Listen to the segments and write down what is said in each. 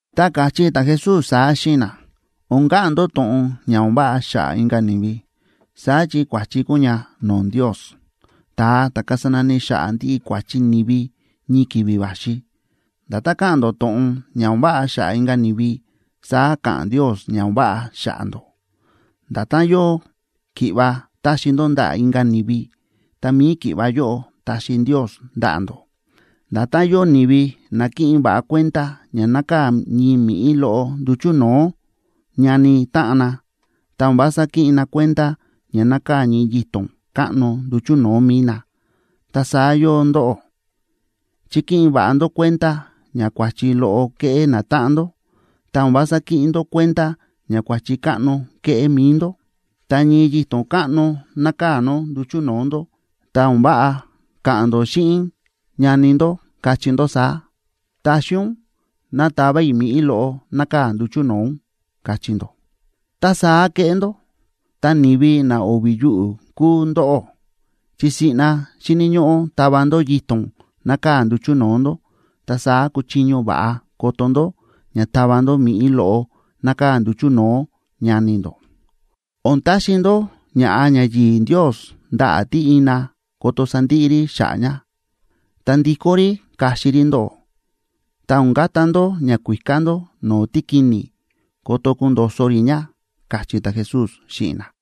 Ta káchí ta̱Jesús saá xíꞌin na: ―O̱n ka̱ꞌa̱n ndó to̱ꞌon ña o̱n váꞌa xa̱ꞌa̱ inka̱ ni̱vi, saá chi kua̱chi kúu ña no̱o̱ Ndios, ta̱a ta̱ kasa nani xa̱ꞌa̱ ndiꞌi kua̱chi ni̱vi ñii ki̱vi̱ va̱xi. Nda̱tán ka̱ꞌa̱n ndó to̱ꞌon ña o̱n váꞌa xa̱ꞌa̱ inka̱ ni̱vi, saá ka̱ꞌa̱n Ndios ña o̱n váꞌa xa̱ꞌa̱ ndó. Nda̱tán yóo ki̱ꞌva taxi ndó ndaꞌa̱ inka̱ ni̱vi, ta mi̱i ki̱ꞌva yóꞌo taxi Ndios ndaꞌa̱ ndó. Nda̱tán yóo ni̱vi na kíꞌin va̱ꞌa kuenda ña nákaa̱ ñii mi̱ꞌí loꞌo nduchu̱ no̱o̱ ñani táꞌan na, ta o̱n vása kíꞌin na kuenda ña nákaa̱ ñii yito̱n káꞌno nduchu̱ no̱o̱ mi̱i na, ta saá yóo ndóꞌó, chi kíꞌin va̱ꞌa ndó kuenda ña kua̱chi loꞌo kéꞌé natáꞌan ndó, ta o̱n vása kíꞌin ndó kuenda ña kua̱chi káꞌno kéꞌé mi̱i ndó. Tá ñii yito̱n káꞌno nákaa̱ nó nduchu̱ no̱o̱ ndó, ta o̱n váꞌa ka̱ꞌa̱n ndó xíꞌin ñani ndó, kachí ndó saá: “Taxi ún ná tava i̱ mi̱ꞌí loꞌo nákaa̱ nduchu̱ no̱o̱ ún”, kachí ndó. Tá saá kéꞌé ndó, ta, ¡ni̱vi na o̱vi̱ yuꞌu̱ kúu ndóꞌó! Chi siꞌna xíni̱ ñóꞌó tava ndó yito̱n nákaa̱ nduchu̱ no̱o̱ ndó, ta saá kuchiño va̱ꞌa koto ndó ña tava ndó mi̱ꞌí loꞌo nákaa̱ nduchu̱ no̱o̱ ñani ndó. ’O̱n taxi ndó ña̱ꞌa ñayi̱i̱ Ndios ndaꞌa̱ tí ina ko̱to̱ sandiꞌi rí xa̱ꞌa̱ ña, ta ndikó rí kaxi rí ndóꞌó. Ta o̱n kata ndó ñakuíká ndó no̱o̱ tíkini̱ ko̱to̱ kundo̱so̱ rí ña ―káchí ta̱Jesús xíꞌin na.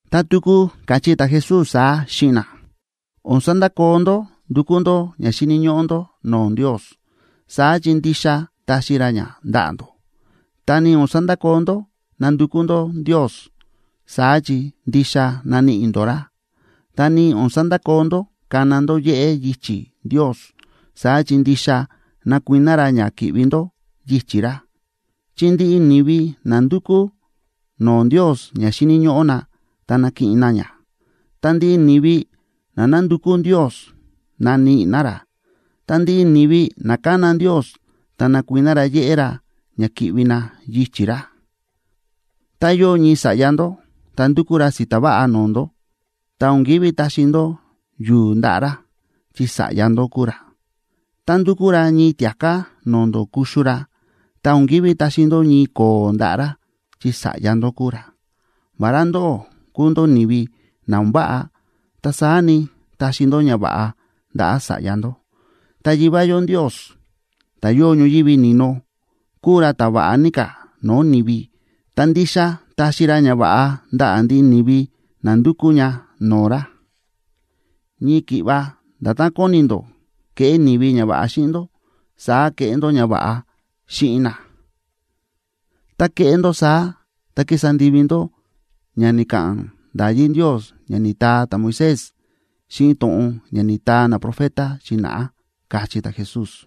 Ta tuku káchí ta̱Jesús saá xíꞌin na: ―O̱n sandakoo ndó ndúkú ndó ña xíni̱ ñóꞌó ndó no̱o̱ Ndios, saá chi ndixa taxi ra ña ndaꞌa̱ ndó. Ta ni o̱n sandakoo ndó nándukú ndó Ndios, saá chi ndixa naníꞌi ndó ra. Ta ni o̱n sandakoo ndó kána ndó yéꞌé yichi̱ Ndios, saá chi ndixa nakuiná ra ña ki̱ꞌvi ndó yichi̱ ra. Chi ndiꞌi ni̱vi na ndúkú no̱o̱ Ndios ña xíni̱ ñóꞌó na, ta nakiꞌin na ña. Ta ndiꞌi ni̱vi na nándukú Ndios, naníꞌi na ra. Ta ndiꞌi ni̱vi na kána Ndios, ta nakuiná ra yéꞌé ra ña ki̱ꞌvi na yichi̱ ra. ’Tá yóo ñii sa̱ꞌya ndó, tá ndúkú ra si̱ta̱ váꞌa no̱o̱ ndó, ta o̱n ki̱ví taxi ndó yu̱u̱ ndaꞌa̱ ra, chi sa̱ꞌya ndó kúu ra. Tá ndúkú ra ñii tia̱ká no̱o̱ ndó kuxu ra, ta o̱n ki̱ví taxi ndó ñii ko̱o̱ ndaꞌa̱ ra, chi sa̱ꞌya ndó kúu ra. Vará ndóꞌó kúu ndó ni̱vi na o̱n váꞌa, ta saá ni, táxi ndó ñava̱ꞌa ndaꞌa̱ sa̱ꞌya ndó. Ta Yivá yó Ndios, ta̱ yóo ñoyívi ni̱no, kúu ra ta̱ va̱ꞌa ní ka̱ no̱o̱ ni̱vi, ta ndixa taxi ra ñava̱ꞌa ndaꞌa̱ ndiꞌi ni̱vi na ndukú ña no̱o̱ ra. ’Ñii ki̱ꞌva nda̱tán kóni ndó keꞌé ni̱vi ñava̱ꞌa xíꞌin ndó, saá keꞌé ndó ñava̱ꞌa xíꞌin na. Tá kéꞌé ndó saá, ta kísa ndivi ndó ña ni̱ka̱ꞌa̱n nda̱yí Ndios ña ni̱taa ta̱Moisés xíꞌin to̱ꞌon ña ni̱taa naprofeta xi̱na̱ꞌá ―káchí ta̱Jesús.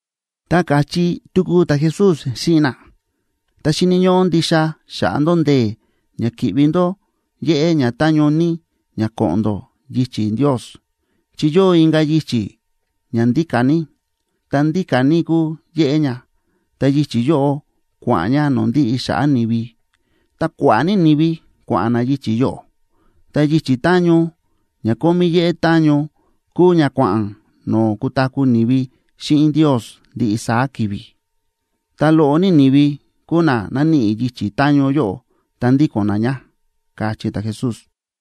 Ta káchí tuku ta̱Jesús xíꞌin na: ―Ta xíni̱ ñóꞌó ndixa xaꞌa ndó ndee̱ ña ki̱ꞌvi ndó yéꞌé ña táñó ní ña ko̱ꞌo̱n ndó yichi̱ Ndios. Chi yóo inka̱ yichi̱ ña ndíka̱ ní, ta ndíka̱ ní kúu yéꞌé ña; ta yichi̱ yóꞌo kua̱ꞌa̱n ña no̱o̱ ndiꞌi xa̱ꞌa̱ ni̱vi, ta kua̱ꞌa̱ ní ni̱vi kua̱ꞌa̱n na yichi̱ yóꞌo. Ta yichi̱ táñó ña kómí yéꞌé táñó, kúu ña kua̱ꞌa̱n no̱o̱ kutaku̱ ni̱vi xíꞌin Ndios ndiꞌi saá ki̱vi̱, ta loꞌo ní ni̱vi kúu na náníꞌi yichi̱ táñó yóꞌo ta ndíko̱n na ña ―káchí ta̱Jesús.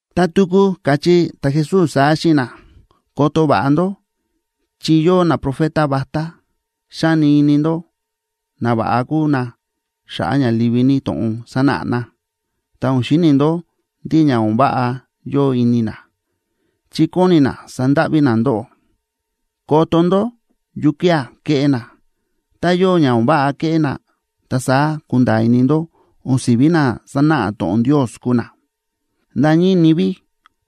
Ta tuku káchí ta̱Jesús saá xíꞌin na: ―Koto va̱ꞌa ndó chi yóo naprofeta vatá. Xáni ini ndó nava̱ꞌa kúu na xa̱ꞌa̱ ña livi ní to̱ꞌon sánáꞌa na, ta o̱n xíni ndó ndí ña o̱n váꞌa yóo ini na, chi kóni na sandáꞌví na ndóꞌó. Koto ndó yukía̱ kéꞌé na, tá yóo ña o̱n váꞌa kéꞌé na, ta saá kunda̱a̱ ini ndó o̱n si̱ví na sánáꞌa to̱ꞌon Ndios kúu na. Nda̱ ñii ni̱vi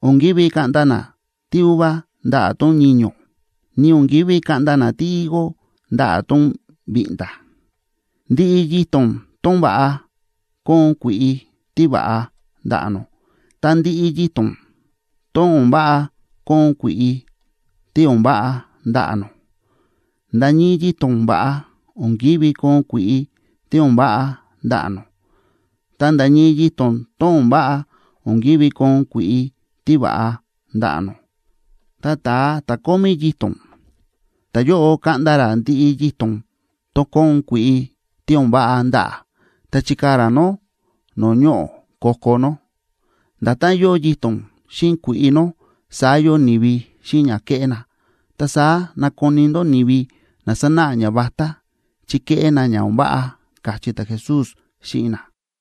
o̱n ki̱ví kaꞌnda na tíuva ndaꞌa̱ tón ñiño̱, ni o̱n ki̱ví kaꞌnda na tíhigo ndaꞌa̱ tón viꞌnda̱. Ndiꞌi yito̱n tón va̱ꞌa, kóon kui̱ꞌi tíva̱ꞌa ndaꞌa̱ nó, ta ndiꞌi yito̱n tón o̱n váꞌa, kóon kui̱ꞌi tí o̱n váꞌa ndaꞌa̱ nó. Nda̱ ñii yito̱n tón va̱ꞌa, o̱n ki̱ví koon kui̱ꞌi tí o̱n váꞌa ndaꞌa̱ nó. Ta nda̱ ñii yito̱n tón o̱n váꞌa, o̱n ki̱ví koon kui̱ꞌi tíva̱ꞌa ndaꞌa̱ nó. Ta ta̱a ta̱ kómí yito̱n, ta̱yóꞌo kaꞌnda ra ndiꞌi yito̱n tón kóon kui̱ꞌi tí o̱n váꞌa ndaꞌa̱, ta chikaa̱ ra nó no̱o̱ ñoꞌo̱ ko̱ko̱ nó. Nda̱tán yóo yito̱n xíꞌin kui̱ꞌi nó, saá yóo ni̱vi xíꞌin ña kéꞌé na. Ta saá nakoni ndó ni̱vi na sánáꞌa ñavatá, chi kéꞌé na ña o̱n váꞌa ―káchí ta̱Jesús xíꞌin na.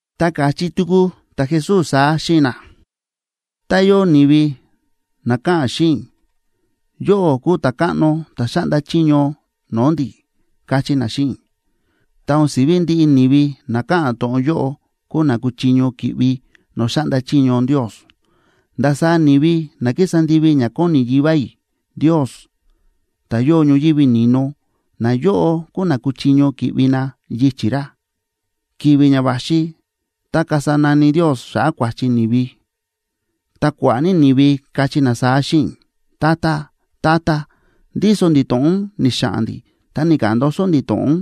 Ta káchí tuku ta̱Jesús saá xíꞌin na: ―Tá yóo ni̱vi na káꞌa̱n xíꞌin i̱: “Yóꞌó kúu Ta̱káꞌno ta̱ xáꞌnda chiño no̱o̱ ndi̱”, káchí na xíꞌin i̱, ta o̱n si̱ví ndiꞌi ni̱vi na káꞌa̱n to̱ꞌon yóꞌo kúu na kuchiño ki̱ꞌvi no̱o̱ xáꞌnda chiño Ndios. Ndasaá ni̱vi na kísa ndivi ña kóni Yivá i̱ Ndios, ta̱ yóo ñoyívi ni̱no, nayóꞌo kúu na kuchiño ki̱ꞌvi na yichi̱ ra. Ki̱vi̱ ña va̱xi tá kasa nani Ndios xa̱ꞌa̱ kua̱chi ni̱vi, ta kua̱ꞌa̱ ní ni̱vi kachí na saá xíꞌin i̱: “Tata, Tata, ndíso ndi̱ to̱ꞌon ni̱xa̱ꞌa̱n ndi̱ ta ni̱ka̱ꞌa̱n ndoso ndi̱ to̱ꞌon ún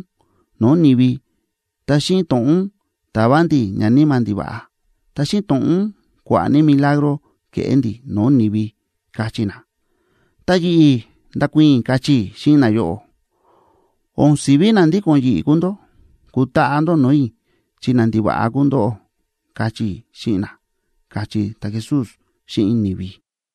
no̱o̱ ni̱vi, ta xíꞌin to̱ꞌon ún ta̱va ndi̱ ñaníma̱ ndiva̱ꞌa, ta xíꞌin to̱ꞌon ún kua̱ꞌa̱ ní milagro ke̱ꞌé ndi̱ no̱o̱ ni̱vi”, kachí na. Ta yi̱ꞌi̱ ndakuii̱n i̱, kachí i̱ xíꞌin nayóꞌo: “O̱n si̱ví na ndíko̱n yi̱ꞌi̱ kúu ndó, kutaꞌa ndó no̱o̱ i̱, chi nandiva̱ꞌa kúu ndóꞌó”, kachí i̱ xíꞌin na ―káchí ta̱Jesús xíꞌin ni̱vi.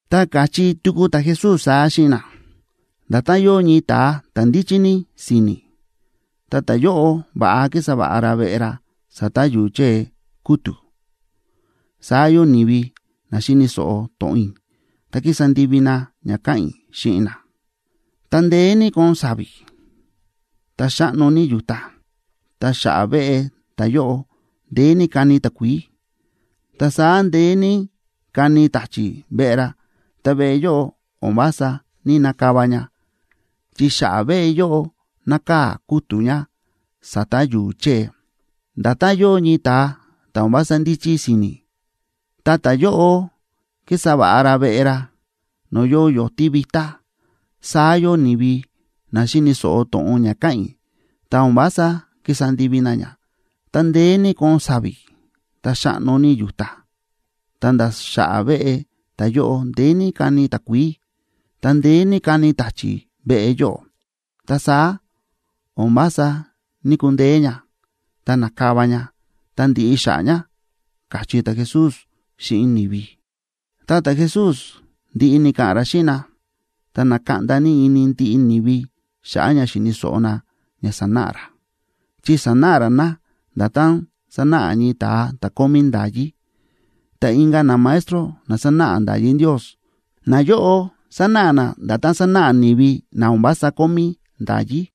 Ta káchí tuku ta̱Jesús saá xíꞌin na: ―Nda̱tán yóo ñii ta̱a ta̱ ndíchí ní si̱ni̱, ta ta̱yóꞌo va̱ꞌa kísa va̱ꞌa ra veꞌe ra sa̱ta̱ yu̱u̱ chée kútu̱, saá yóo ni̱vi na xíni̱ so̱ꞌo to̱ꞌon i̱, ta kísa ndivi na ña káꞌa̱n i̱ xíꞌin na. Ta ndeé ní kóon sa̱vi̱, ta xáꞌno ní yu̱ta, ta xa̱ꞌa̱ veꞌe ta̱yóꞌo ndeé ní káni takuií, ta saá ndeé ní káni ta̱chi̱ veꞌe ra, ta veꞌe yóꞌo o̱n vása ní‑nakava ña, chi xa̱ꞌa̱ veꞌe yóꞌo nákaa̱ kútu̱ ña sa̱ta̱ yu̱u̱ chée. Nda̱tán yóo ñii ta̱a ta̱ o̱n vása ndíchí si̱ni̱, ta ta̱yóꞌo kísa va̱ꞌa ra veꞌe ra no̱o̱ yóo yo̱tí vitá, saá yóo ni̱vi na xíni̱ so̱ꞌo to̱ꞌon ña káꞌa̱n i̱, ta o̱n vása kísa ndivi na ña. Ta ndeé ní kóon sa̱vi̱, ta xáꞌno ní yu̱ta, ta̱nda̱ xa̱ꞌa̱ veꞌe ta̱yóꞌo ndeé ní káni takuií, ta ndeé ní káni ta̱chi̱ veꞌe yóꞌo, ta saá o̱n vása ní‑kundeé ña, ta na̱kava ña ta ndi̱ꞌi xa̱ꞌa̱ ña ―káchí ta̱Jesús xíꞌin ni̱vi. Tá ta̱Jesús ndi̱ꞌi ni̱ka̱ꞌa̱n ra xíꞌin na, ta na̱kaꞌnda ini ndiꞌi ni̱vi xa̱ꞌa̱ ña xíni̱ so̱ꞌo na ña sánáꞌa ra, chi sánáꞌa ra na nda̱tán sánáꞌa ñii ta̱a ta̱ kómí nda̱yí, ta inka̱ namaestro na sánáꞌa nda̱yí Ndios, nayóꞌo sánáꞌa na nda̱tán sánáꞌa ni̱vi na o̱n vása kómí nda̱yí.